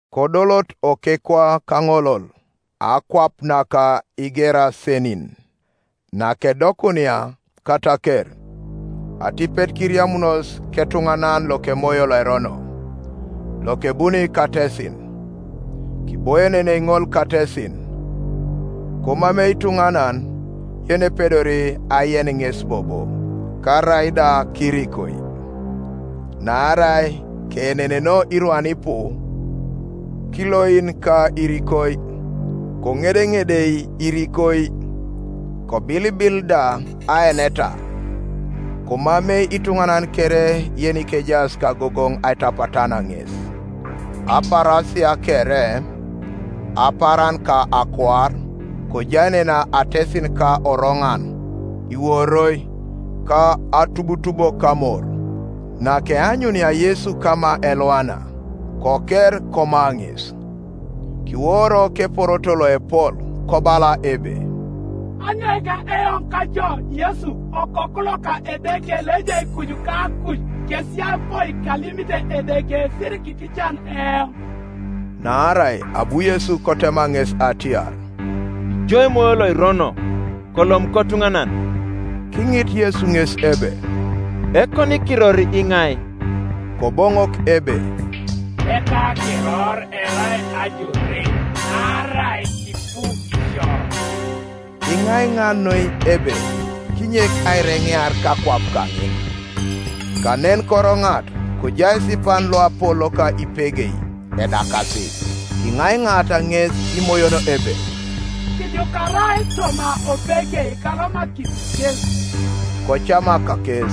Kodolot okekwa kaŋolol, akwap naka Igerasenin. Nakedokunia kataker, atipet kiriamunos ketuŋanan lokemoyo loerono, lokebuni katesin, Kiboienenei ŋol katesin. Komamei ituŋanan yenepedori aien ŋes bobo, karaida kirikoi; naarai keenenenoo irwan ipu kiloin ka irikoi, koŋedeŋedei irikoi, kobilibil da aeneta; komamei ituŋanan kere yenikejaas kagogoŋ aitapatan ŋes, Apaarasia kere, apaaran ka akuar, kojaenena atesin ka oroŋan, iworoi, ka atubutubo kamor. Nakeanyunia Yesu kama elwana, koker koma ŋes. Kiworo keporoto loepol, kobala ebe, “Anyoika eoŋ ka jo, Yesu, Okoku loka Edeke Loejai kuju kakuj? Kesiyapoi kalimite Edeke, sirikiitican eoŋ.” Naarai abu Yesu kotema ŋes atiar, “Ijo emoyo loirono, kolom kotuŋanan!” Kiŋit Yesu ŋes ebe, “Ekonikiror iŋai?” Koboŋok ebe, “Ekakiror erai Ajore; naarai kipu isio.” Kiŋaiŋa noi ebe kinyek aireŋear kakwap kaŋin. Kanen koroŋat kojai esipan loapol loka ipegei edakasi. Kiŋaiŋaata ŋes imoyon ebe, “Kijukarai toma opegei, kalomakisi kes.” Kocamak kes.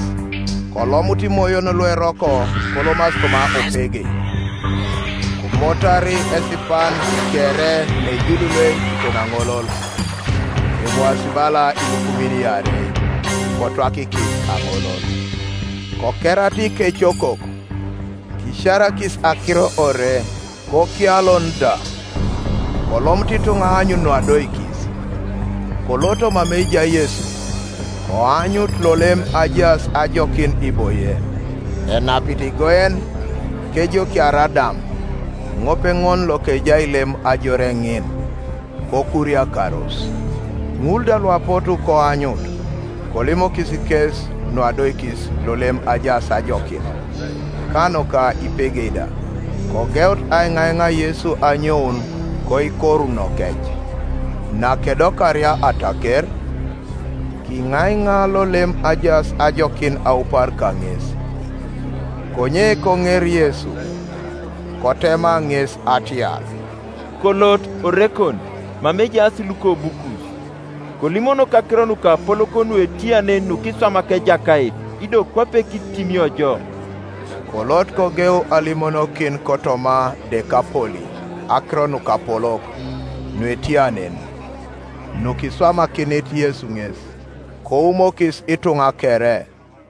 Kolomut imoyon lueroko kolomasi toma opegei: komotar esipan kere neijululuei kiton aŋolol, emwaasi bala ilukumin iarei; kotwakikis aŋolol. Kokerata ikecokok, kisiarakis akiro ore, kokialon da. Kolomut ituŋa aanyun nuadoikis. Koloto mama ejai Yesu, koanyut lolem ajaas ajokin iboie, enapit igoen, kejokiar adam, ŋopeŋol lokejai lem ajore ŋin; kokuriakaros. Ŋul da luapotu koanyut kolimokis kes nuadoikis lolem ajaas ajokin, ka nuka ipegei da. Kogeut aiŋaiŋa Yesu anyoun koikorunokec. Nakedokaria ataker, kiŋaiŋa lolem ajaas ajokin aupar kaŋes. Konye koŋer Yesu, kotema ŋes atiar, “Kolot orekon mama ejaas lukobukus, kolimonok akiro nukapolok nuetia nen nukiswamak Ejakait, ido kwape kitimio jo.” Kolot, kogeu alimonokin kotoma Dekapoli akiro nukapolok nuetia nen nukiswamakinit Yesu ŋes; koumokis ituŋa kere.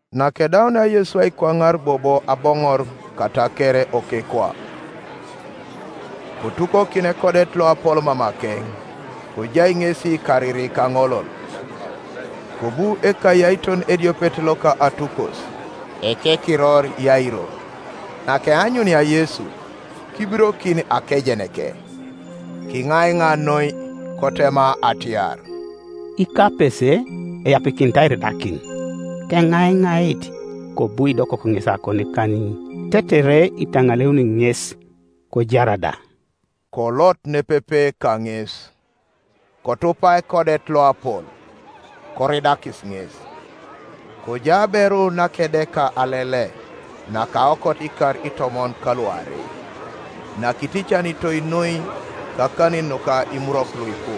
Nakedaunia Yesu aikwaŋar bobo aboŋor kataker okekwa, kotukokin ekodet loapol mamakeŋ; kojai ŋesi kariri kaŋolol. Kobu ekayaiton ediopet loka atukos, ekekiror Yairo; nakeanyunia Yesu, kibirokin akejeneke, kiŋaiŋa noi, kotema atiar, “Ikapese eapikinit airidakin, keŋaiŋait kobu kidokok ŋes akonikanin, tetere itaŋaleuni ŋes, kojar da.” Kolot nepepe kaŋes. Kotupa ekodet loapol, koridakis ŋes. Kojai aberu nakedeka alele nakaokot ikar itomon kaluarei; nakiticanitoi noi kakanin nuka imurwok luipu,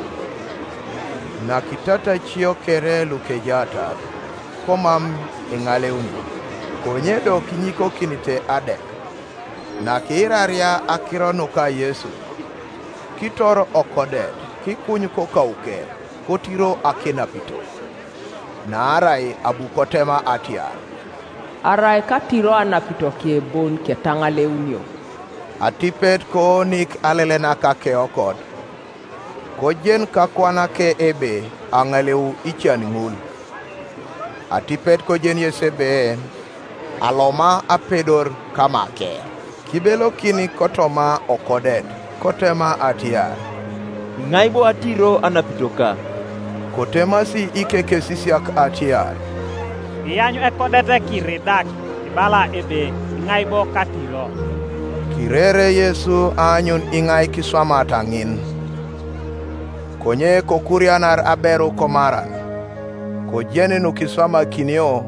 nakitatacio kere lukejaatar, komam eŋaleuni, konye do kinyikokinite adek. Nakiiraria akiro nuka Yesu, kitor okodet kikuny kokauke, kotiro akenapito. Naarai abu kotema atiar, “Arai katiro anapitoke bon ketaŋaleunio.” Atipet koonik alele naka akeokot; kojen kakuanake ebe aŋaleu ican ŋul. Atipet kojen Yesu ebe aloma apedor kamake, kibelokin kotoma okodet, kotema atiar, “Iŋai bo atiro anapitoka?” Kotemasi ikekesisiak atiar, “Iany ekodet kiiridak, ibala ebe, ‘Iŋai bo katiro?’” Kirere Yesu aanyun iŋai kiswamat ŋin, Konye kokurianar aberu komaran, kojen nukiswamakinio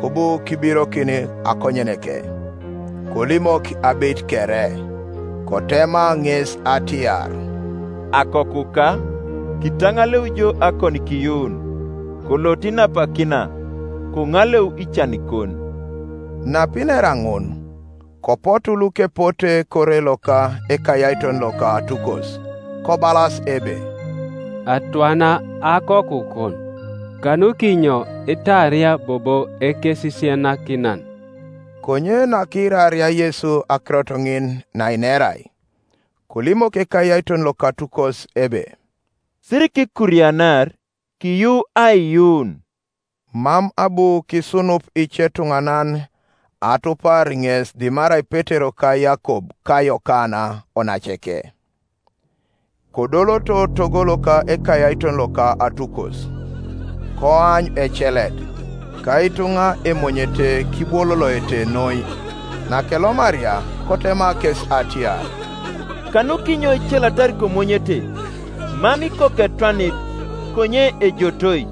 kobu kibirokin akonyeneke, kolimok abeit kere. Kotema ŋes atiar, “Akokuka, kitaŋaleu jo akonikiyuun; kolot inapakina, koŋaleu icanikon.” Napinera ŋun, kopotu lukepote kore loka ekayaiton loka atukos, kobalas ebe, “Atwana akokukon, Kanukinyo itaaria bobo Ekesisianakinan?” Konye nakiiraria Yesu akirot ŋin nainerai, kolimok ekayaiton loka atukos ebe, “Sirikikurianar, kiyuu aiyuun.” Mam abu kisunup icetuŋanan atupar ŋes dimarai Petero ka Yakob ka Yokana onaceke. Kodoloto togo loka ekayaiton loka atukos, koany ecelet, ka ituŋa emonyete kibwololoete noi. Nakelomaria, kotema kes atiar, “Kanukinyo icelatar komonyete? Mam ikoku etwanit, konye ejotoi.”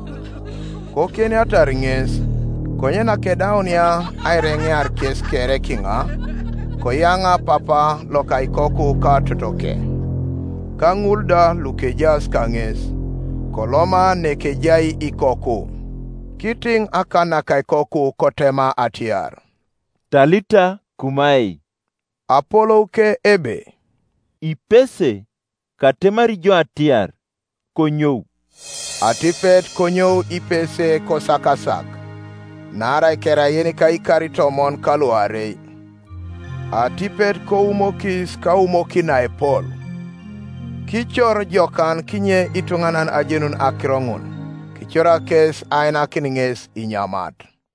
Kokienatar ŋes. Konye nakedaunia aireŋear kes kere kiŋa, koyaŋa papa loka ikoku ka totoke, ka ŋul da lukejaas kaŋes, koloma nekejai ikoku. Kitiŋ akan naka ikoku kotema atiar, “Talita kumai”; apolouke ebe, “Ipese katemari jo atiar, konyou.” Atipet konyou ipese kosakasak; naarai kerai yenika ikar itomon kaluarei. Atipet koumokis kaumokin naepol. Kicor jokan kinye ituŋanan ajenun akiro ŋun, kicorak kes ainakin ŋes inyamat.